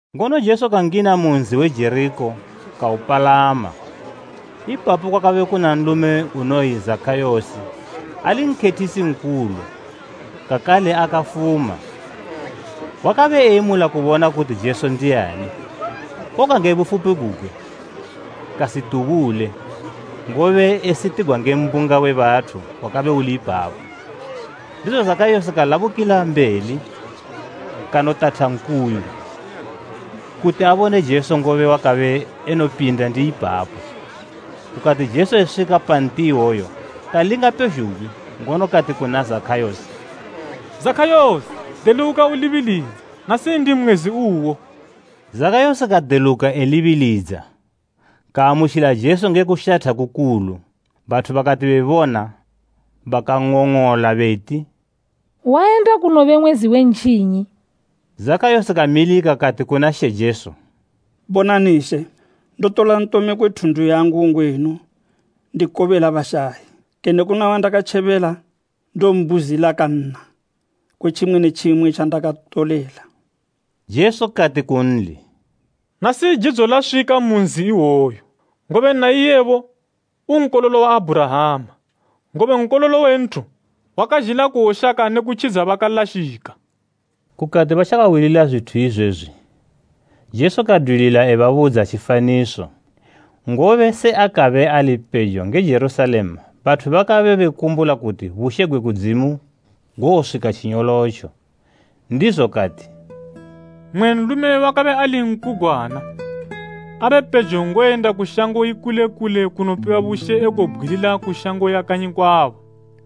Ngono Jesu kangina mu nzi we Jerikho kaupalama. Ipapo kwakabe kuna nlume unoyi Zakhayosi, ali nkhethisi nkulu, kakale akafuma. Wakabe eyemula kubona kuti Jesu ndiani, koga nge bufupi gugwe, kasitubule, ngobe esitigwa nge mbunga we bathu wakabe uli ipapo. Ndizo Zakhayosi kalabukila mbeli, kanotatha nkuyu, kuti abone Jesu ngobe wakabe enopinda ndi ipapo. Kukati Jesu eswika pa nti iwoyo kalinga pezhugwi ngono kati kuna Zakhayosi, “Zakhayosi, deluka ulibilidza, nasi ndi mwezi uwo.” Zakhayosi kadeluka elibilidza, kaamutjila Jesu nge kushatha kukulu. Bathu bakati bebona, bakang'ong'ola beti, “Wayenda kunobe mwezi we ntjinyi.” Zakhayosi kamilika kati kuna She Jesu, “Bonani She, ndotola ntome kwe thundu yangu ngwenu ndikobela bashayi. Kene kuna wandakatjebela, ndombuzila kanna kwe tjimwe ne tjimwe tjandakantolela.” Jesu kati kunli, “Nasi jidzo laswika mu nzi iwoyu, ngobe naiyebo, u nkololo wa Abhurahama. Ngobe Nkololo we Nthu wakazhila kuwoshaka ne kutjidza bakalashika.” Kukati batjakahwilila zwithu izwezwi, Jesu kadwilila ebabudza tjifaniso, ngobe se akabe ali pejo nge Jerusalema bathu bakabe bekumbula kuti bushe gwe kudzimu gowoswika tjinyolotjo. Ndizo kati, “Mmwe nlume wakabe ali nkugwana abe pejo ngoyenda ku shango ikule kule kunopiwa bushe ekowobgwilila ku shango ya kanyi kwabo.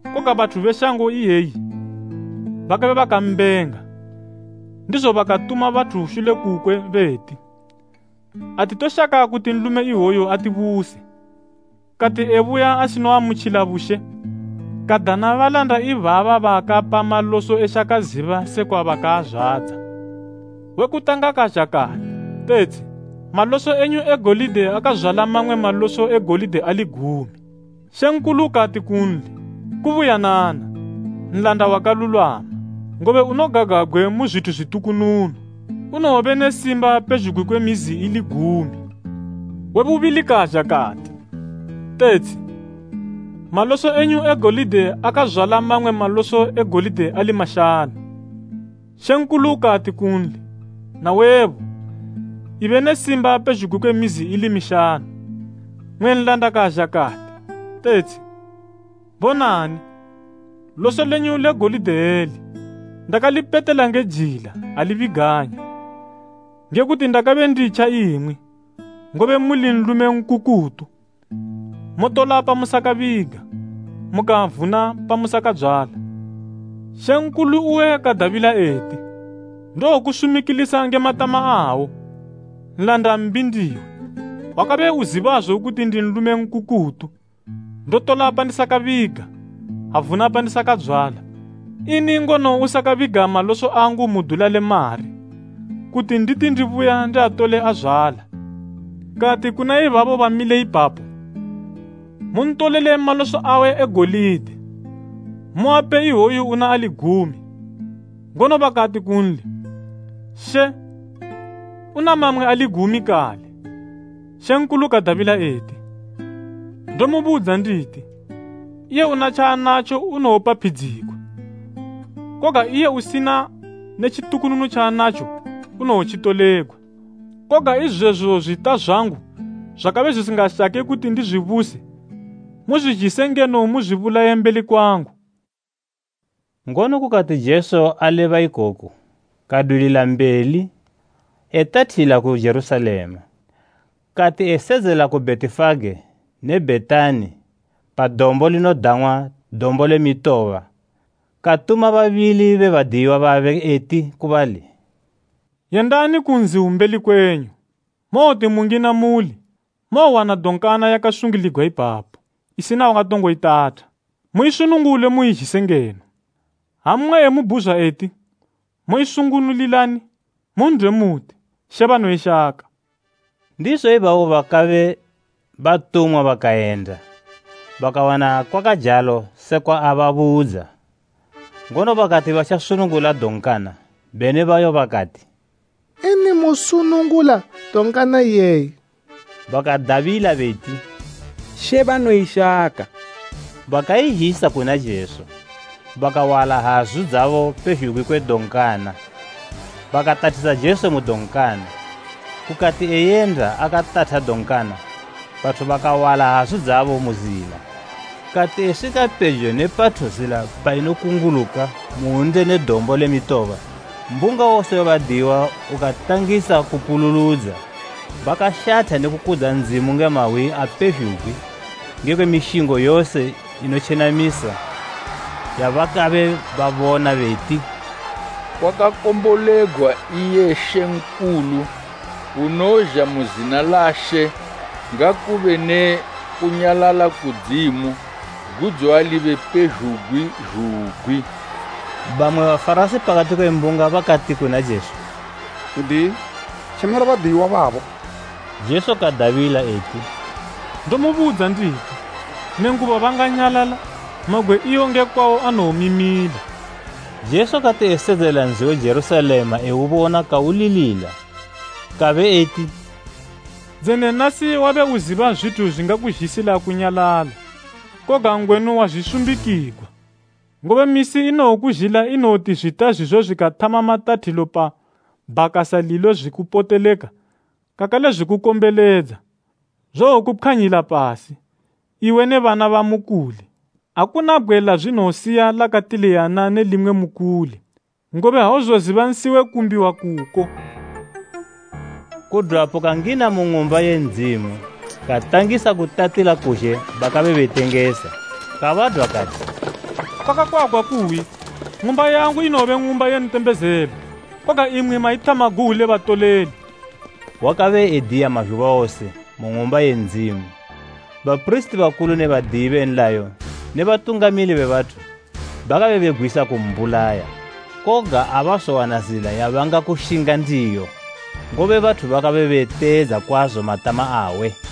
Koga bathu be shango iye bakabe bebenga, ndizo bakatuma bathu shule kukwe beti, ‘Atitoshaka kuti nlume iwoyu atibuse.’ “Kati ebuya asinoamutjila bushe, kadana balanda ibaba baakapa maloso eshaka ziba sekwa bakaazwadza. We kutanga kazha kati, ‘Tetshi, maloso enyu e golide akazwala mamwe maloso e golide ali gumi.’ Mambo kati kunli, ‘Kubuyanana, nlanda wakalulwama. Ngobe unogagwabgwe mu zwithu zwitukununu. Unowobe ne simba pezhugwi kwe mizi ili gumi.’ We bubili kazha kati, ‘Tetshi maloso enyu e golide akazwala mamwe maloso e golide ali mashanu.’ Mambo kati kunli, ‘Nawebo, ibe ne simba pezhugwi kwe mizi ili mishanu.’ “Mmwe nlanda kazha kati, ‘Tetshi, bonani, loso lenyu le golide eli. Ndakalipetela nge jila, ali biganya. Ngekuti ndakabe nditja imwi, ngobe muli nlume nkukutu. Motola pamusakabiga, mukavuna pamusakadzwala.’ Mambo uwe kadabila eti, ‘Ndowokusumikilisa nge matama awo, nlanda mbi ndiwe. Wakabe uzibazo kuti ndi nlume nkukutu, ndotola pandisakabiga, avuna pandisakadzwala. Ini ngono usakabiga maloso angu mu dula le mari, kuti nditi ndibuya ndiatole azwala?’ “Kati kuna ibabo bamile ipapo, ‘Muntolele maloso awe e golide, muape iwoyu una ali gumi.’ Ngono bakati kunli, ‘She, una mamwe ali gumi kale!’ Mambo kadabila eti, ‘Ndomubudza nditi, iye una tjaanatjo unowopaphidzigwa, koga iye usina ne tjitukununu tjaanatjo unowotjitolegwa. Koga izwezo zwita zwangu zwakabe zwisingashake kuti ndizwibuse, muzwizhise ngeno muzwibulaye mbeli kwangu.’” Ngono kukati Jesu aleba ikoku, kadwilila mbeli etathila ku Jerusalema. Kati esedzela ku Bhetifage ne Bhetani pa dombo linodang'wa Dombo le Mitoba, katuma babili be badiyiwa babe eti ku bali, “Yendani ku nzi umbeli kwenyu, mowoti mungina muuli, mowowana donkana yakasungiligwa ipapo, isina wakatongo itatha. Muisunungule muizhise ngeno. Ha mmwe emubhuzwa eti, ‘Moisunungulilani?’ Mun'dwe muti, ‘She banoishaka.’” Ndizo ibabo bakabe batumwa bakayenda, bakawana kwakajalo sekwa ababudza. Ngono bakati batjasunungula donkana, beni bayo bakati, “Ini musunungula donkana iyeyi?” Bakadabila beti, “She banoishaka.” Bakaizhisa kuna Jesu, bakawala hazu dzabo pezhugwi kwe donkana, bakatathisa Jesu mu donkana. Kukati eyenda akatatha donkana, bathu bakawala hazu dzabo mu zila. Kati eswika pejo ne pathu zila painokunguluka mu hwunde ne Dombo le Mitoba, mbunga wose we badiyiwa ukatangisa kupululudza bakashatha ne kukudza Ndzimu nge mahwi apezhugwi ngekwe mishingo yose inotjenamisa yabakabe babona beti, “Kwakakombolegwa iye mambo unozha mu zina la She! Ngakube ne kunyalala kudzimu, gudzo alibe pezhugwi zhugwi!” Bamwe Bafarasi pakati kwe mbunga bakati kuna Jesu, “N'diyi, tjemela badiyiwa babo!” Jesu kadabila eti, “Ndomubudza nditi, nenguba banganyalala, mabgwe iwo nge kwawo anowomimila.” Jesu kati esedzelela nzi we Jerusalema eubona kaulilila, kabe eti, “Dzene nasi wabe uziba zwithu zwingakuzhisila kunyalala! Koga ngwenu wazwisumbikigwa. Ngobe misi inowokuzhila inowoti zwita zwizo zwikathama matathilo pa bhakasa lilo zwikupoteleka, kakale zwikukombeledza. Zowokupkhwanyila pasi, iwe ne bana bamukuli. Akuna bgwe lazwinowosiya lakatiliyana ne limwe mukuli, ngobe auzoziba nsi we kumbiwa kuko.” Kudwapo kangina mu Ng'umba ye Ndzimu, katangisa kutatila kuzhe bakabe betengesa. Kabadwa kati, “Kwakakwagwa kuyi, ‘Ng'umba yangu inowobe ng'umba ye ntembezelo,’ koga imwi maithama guwu le batoleli.” Wakabe ediya mazhuba wose mu Ng'umba ye Ndzimu. Bapirisiti bakulu ne badiyi be nlayo ne batungamili be bathu bakabe begwisa kumbulaya. Koga abazowana zila yabangakushinga ndiyo, ngobe bathu bakabe beteedza kwazo matama awe.